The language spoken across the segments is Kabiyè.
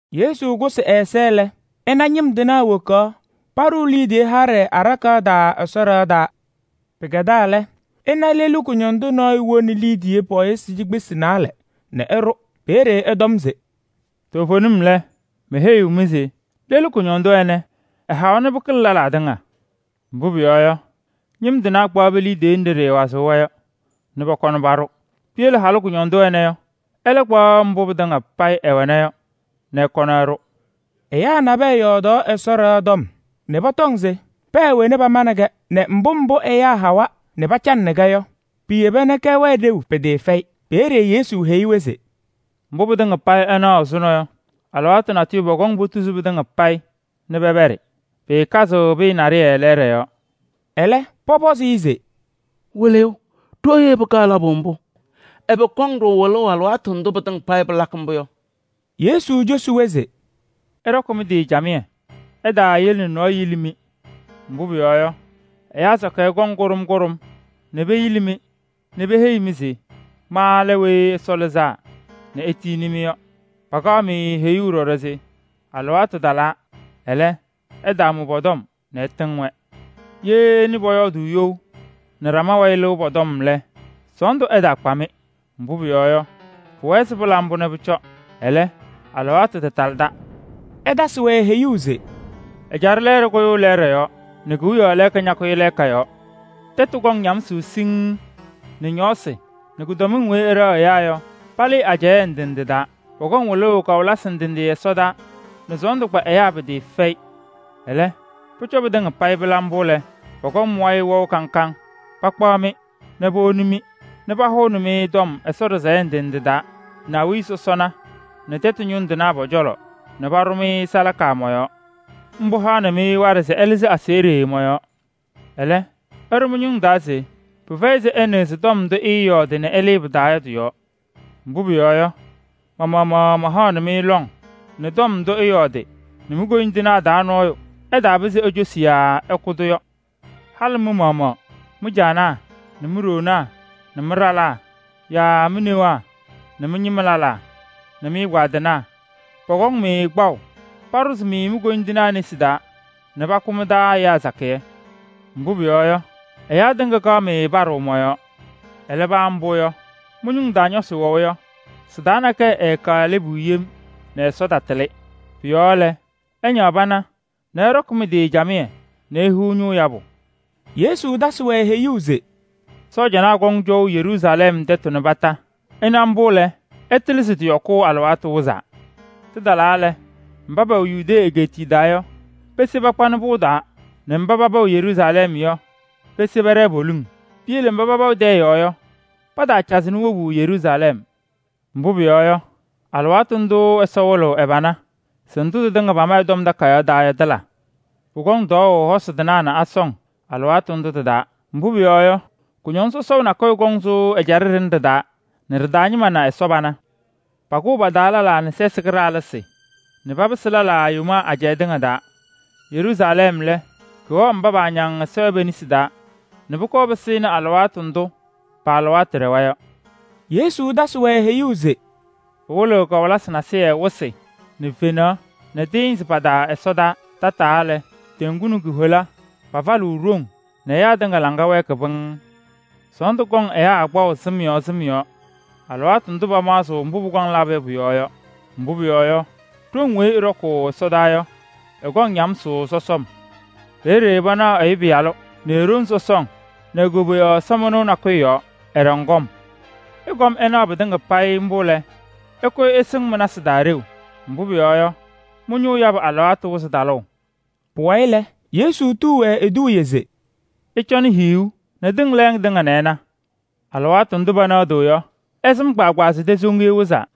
Yesu kʋsɩ ɛ-ɛza lɛ, ɛna ñɩm tɩnaa wokaɣ paɖʋʋ liidiye haɖɛ aɖakaɣ taa Ɛsɔ ɖɩɣa taa. Pɩkɛdaa lɛ, ɛna lelu kʋñɔndʋ nɔɔyʋ woni liidiye pɔɔyɩsɩ cikpesi naalɛ nɛ ɛɖʋ. Peeye ɛtɔm se: “Toovenim lɛ, meheyiɣ-mɩ se lelu kʋñɔndʋ ɛnɛ, ɛhawa nɛ pɩkɩlɩ lɛlaa tɩŋa. Mbʋ pʋyɔɔ yɔ, ñɩm tɩnaa kɔyɩ pe-liidiye katɩnaɣ yɔɔ nɛ pɔkɔnɩ paɖʋ. Piyele halʋ kʋñɔndʋ ɛnɛ yɔ, ɛlɛ kpaɣ mbʋ pɩtɩŋa payɩ ɛwɛna yɔ nɛ ɛkɔnɩ ɛɖʋ.” Ɛyaa nabɛyɛ yɔɔdaɣnɩ Ɛsɔ ɖɩɣa tɔm se pɛɛ wena pamanɩ-kɛ nɛ mbʋ mbʋ ɛyaa hawa nɛ pacanɩnɩ-kɛ yɔ, piyeba nɛ kɛwɛɛ ɖeu pɩtɩɩfɛyɩ. Peeye Yesu heyi-wɛ se: “Mbʋ pɩtɩŋa payɩ ɩnaɣ ɛzʋnɔ yɔ, alɩwaatʋ natʋyʋ pɔkɔŋ tuzuu pɩtɩŋa payɩ nɛ pɛpɛɖɩ. Pɩɩkazɩɣ pɩyɛ naɖɩyɛ lɛɛɖɛ yɔɔ.” Ɛlɛ, pɔpɔzɩ-ɩ se: “Wɩlɩyʋ! Ɖooye pɩkaɣ labʋ mbʋ? Ɛbɛ kɔŋ-ɖʋ wɩlʋʋ alɩwaatʋ ndʋ pɩtɩŋa payɩ pɩlakɩ mbʋ yɔ?” Yesu cosi-wɛ se: “Ɩɖɔkɩ mɩ-tɩ camɩyɛ, ɩtaayele nɛ nɔɔyʋ yili-mɩ. Mbʋ pʋyɔɔ yɔ, ɛyaa sakɩyɛ kɔŋ Kʋɖʋm kʋɖʋm nɛ peyili-mɩ nɛ peheyi-mɩ se: ‘Ma lɛ Weyi Ɛsɔ Lɩzaa nɛ etiyini-mɩ’ yɔ. Pakaɣ-mɩ heyuu ɖɔɖɔ se: ‘Alɩwaatʋ talaa.’ Ɛlɛ, ɩtaamʋ pɔ-tɔm nɛ ɩtɩŋ-wɛ. Ye ɩnɩ pɔyɔɔdʋʋ you nɛ ɖama wayɩ lɩʋ pɔ-tɔm lɛ, sɔɔndʋ ɛtaakpa-mɩ. Mbʋ pʋyɔɔ yɔ, pʋwɛɛ se pɩla mbʋ nɛ pʋcɔ. Ɛlɛ, alɩwaatʋ tatalɩda.” Ɛtasɩ-wɛ heyuu se: “Ɛjaɖɛ lɛɛɖɛ kʋyʋʋ lɛɛɖɛ yɔɔ nɛ kewiyaɣ lɛɛka ñakʋyɩ lɛɛka yɔɔ. Tɛtʋ kɔŋ ñamsʋʋ sɔsɔm nɛ ñɔɔsɩ nɛ kʋdɔmɩŋ weyi ɩɖɛɣ ɛyaa yɔ, palɩɩ ajɛɛ ndɩ ndɩ taa. Pʋkɔŋ wɩlʋʋ kawɩlɩsɩ ndɩ ndɩ ɛsɔdaa nɛ sɔɔndʋ kpa ɛyaa pɩtɩɩfɛyɩ. Ɛlɛ, pʋcɔ nɛ pɩtɩŋa payɩ pɩla mbʋ lɛ, pɔkɔŋ mɩ-wayɩ wɛʋ kaŋ kaŋ. Pakpaɣ-mɩ nɛ powoni-mɩ nɛ pahʋnɩ-mɩ tɔm Ɛsɔ ɖɩsɛyɛ ndɩ ndɩ taa nɛ awiya sɔsɔna nɛ tɛtʋ ñʋŋ tɩnaa pɔ-cɔlɔ nɛ paɖʋ-mɩ salaka mɔ-yɔɔ. Mbʋ haɣnɩ-mɩ waɖɛ se ɩlɩzɩ aseɣɖe mɔ-yɔɔ. Ɛlɛ, ɩɖʋ mɩ-ñʋŋ taa se pɩfɛyɩ se ɩnɩɣzɩ tɔm ndʋ ɩɩyɔɔdɩ nɛ ɩlɩɩ pɩ-taa yɔ tɩ-yɔɔ. Mbʋ pʋyɔɔ yɔ, ma-maɣmaɣ mahaɣnɩ-mɩ lɔŋ nɛ tɔm ndʋ ɩɩyɔɔdɩ nɛ mi-koyindinaa taa nɔɔyʋ ɛtaapɩzɩ ecosi yaa ɛkʋ-tʋ yɔ. Halɩ mɩ-maɣmaɣ mɩ-caanaa nɛ mi-ɖoonaa nɛ mɩ-ɖalaa yaa mi-newaa nɛ mɩ-ñɩma lɛlaa nɛ mɩ-ɛgbaadɩnaa pɔkɔŋnɩ-mɩ kpaʋ paɖʋzɩ mi-koyindinaa nesi taa nɛ pakʋ mɩ-taa ɛyaa sakɩyɛ. Mbʋ pʋyɔɔ yɔ, ɛyaa tɩŋa kaɣ-mɩ paɖʋʋ mɔ-yɔɔ. Ɛlɛ paa mbʋ yɔ, mɩ-ñʋŋ taa nɔsɩ wɛʋ yɔ, sɩ-taa nakɛyɛ eeleki yem nɛ Ɛsɔ tatɩlɩ. Pʋ-yɔɔ lɛ, ɩñaɣ pana ɩɖɔkɩ mɩ-tɩ camɩyɛ nɛ ihiɣ ñʋʋ yabʋ.” Yesu tasɩ-wɛ heyuu se: “Sɔɔjanaa kɔŋ cɔʋ Yeruusalɛm tɛtʋ kondiko. Ɩna mbʋ lɛ, ɩtɩlɩ se tɩ-yɔkʋʋ alɩwaatʋ wɩzaa. Tɩtalaa lɛ, mba pɛwɛ Yudee egeetiye taa yɔ, pese pakpanɩ pʋŋ taa nɛ mba paba wɛ Yeruusalɛm yɔ, pese pɛɖɛɛ poliŋ. Piyele mba paba wɛ tɛyɛ yɔɔ yɔ, pataacazɩ wobu Yeruusalɛm. Mbʋ pʋyɔɔ yɔ, alɩwaatʋ ndʋʋ Ɛsɔ wɩlɩɣ ɛ-pana se ndʋ tɩtɩŋa pama ɛ-Tɔm Takayaɣ taa yɔ tɩla. Pʋkɔŋ tɔɔʋ hosi tɩnaa nɛ asɔŋ alɩwaatʋ ndʋ tɩ-taa. Mbʋ pʋyɔɔ yɔ, kʋñɔŋ sɔsɔʋ nakʋyʋ sʋʋ ɛjaɖɛ ɖɩnɛ ɖɩ-taa nɛ ɖɩ-taa ñɩma na Ɛsɔ pana. Pakʋʋ pa-taa lɛlaa nɛ sɛsɩ kɩɖaɣlɩsɩ nɛ papɩsɩ lɛlaa yomaa ajɛɛ tɩŋa taa. Yeruusalɛm lɛ, kɩwɛɣ mba paañaŋ Ɛsɔ yɔ pe-nesi taa nɛ pʋkɔɔ pɩsɩnɩ alɩwaatʋ ndʋ pa-alɩwaatʋ ɖɛwa yɔ.” Yesu tasɩ-wɛ heyuu se: “Pɩwɩlɩɣ kawɩlɩsɩ nasɩyɩ wɩsɩ nɛ fenaɣ nɛ tɩɩnzɩ pa-taa ɛsɔdaa. Tataa lɛ, teŋgu nɛ ku-hola pafalɩɣ ɖoŋ nɛ ɛyaa tɩŋa laŋa wɛɛkɩ pɩŋŋ. Sɔɔndʋ kɔŋ ɛyaa kpaʋ sɩm yɔɔ sɩm yɔɔ alɩwaatʋ ndʋ pamaɣzɩɣ mbʋ pʋkɔŋ labʋ yɔ pʋ-yɔɔ yɔ. Mbʋ pʋyɔɔ yɔ, ɖoŋ weyi ɩɖɔkʋʋ ɛsɔtɔnʋʋ yɔ, ɩkɔŋ ñamsʋʋ sɔsɔm. Peeye panaɣ Ɛyʋ Pɩyalʋ nɛ e-ɖoŋ sɔsɔŋ nɛ e-koboyaɣ ɛsɔmɩnʋʋ nakʋyʋ yɔɔ, ɛɖɔŋ kɔm. Ɩkɔm ɩnaɣ pɩtɩŋa payɩ mbʋ lɛ, ɩkʋyɩ ɩsɩŋ mɩ-nasɩ taa ɖeu, mbʋ pʋyɔɔ yɔ, mɩ-ñʋʋ yabʋ alɩwaatʋ wɩzɩ talʋʋ.” Pʋwayɩ lɛ, Yesu tuu-wɛ eduuye se: “Ɩcɔnɩ hiyuu nɛ tɩŋ lɛɛŋ tɩŋa nɛ ɩna. Alɩwaatʋ ndʋ pɛnɛɣdɩɣ yɔ, ɩsɩm kpaagbaa se tɛsoŋiye wɩzaa.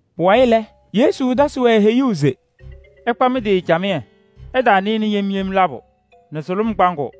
Pʋwayɩ lɛ, Yesu tasɩ-wɛ heyuu se: “Ɩkpa mɩ-tɩ camɩyɛ, ɩɩtaanɩnɩ yem yem labʋ nɛ sʋlʋm kpaŋʋʋ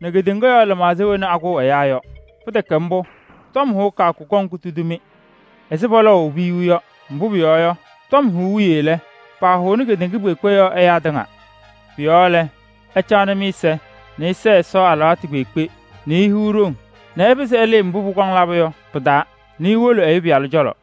nɛ kedeŋa lɩmaɣza wena akʋʋ ɛyaa yɔ. Pɩtɛkɛ mbʋ, tɔm hʋʋ kɩyakʋ kɔŋ kutudi-mɩ ɛzɩ pɔlɔɔʋ piyuu yɔ. Mbʋ pʋyɔɔ yɔ, tɔm hʋʋ wiye lɛ, pahʋʋnɩ kedeŋa kpeekpe yɔɔ ɛyaa tɩŋa. Pʋ-yɔɔ lɛ, ɩcaɣnɩ mɩ-ɛza nɛ ɩsɛɛ Ɛsɔ alɩwaatʋ kpeekpe nɛ ihiɣ ɖoŋ nɛ ɩpɩzɩ ɩlɩɩ mbʋ pʋkɔŋ labʋ yɔ pɩ-taa nɛ iwolo Ɛyʋ Pɩyalʋ cɔlɔ.”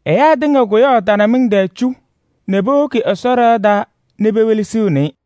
Ɛyaa tɩŋa kʋyaɣ tanamɩŋ tɩŋa tɛɛ cu nɛ powoki Ɛsɔ ɖɩɣa taa nɛ pewelesiɣni-i.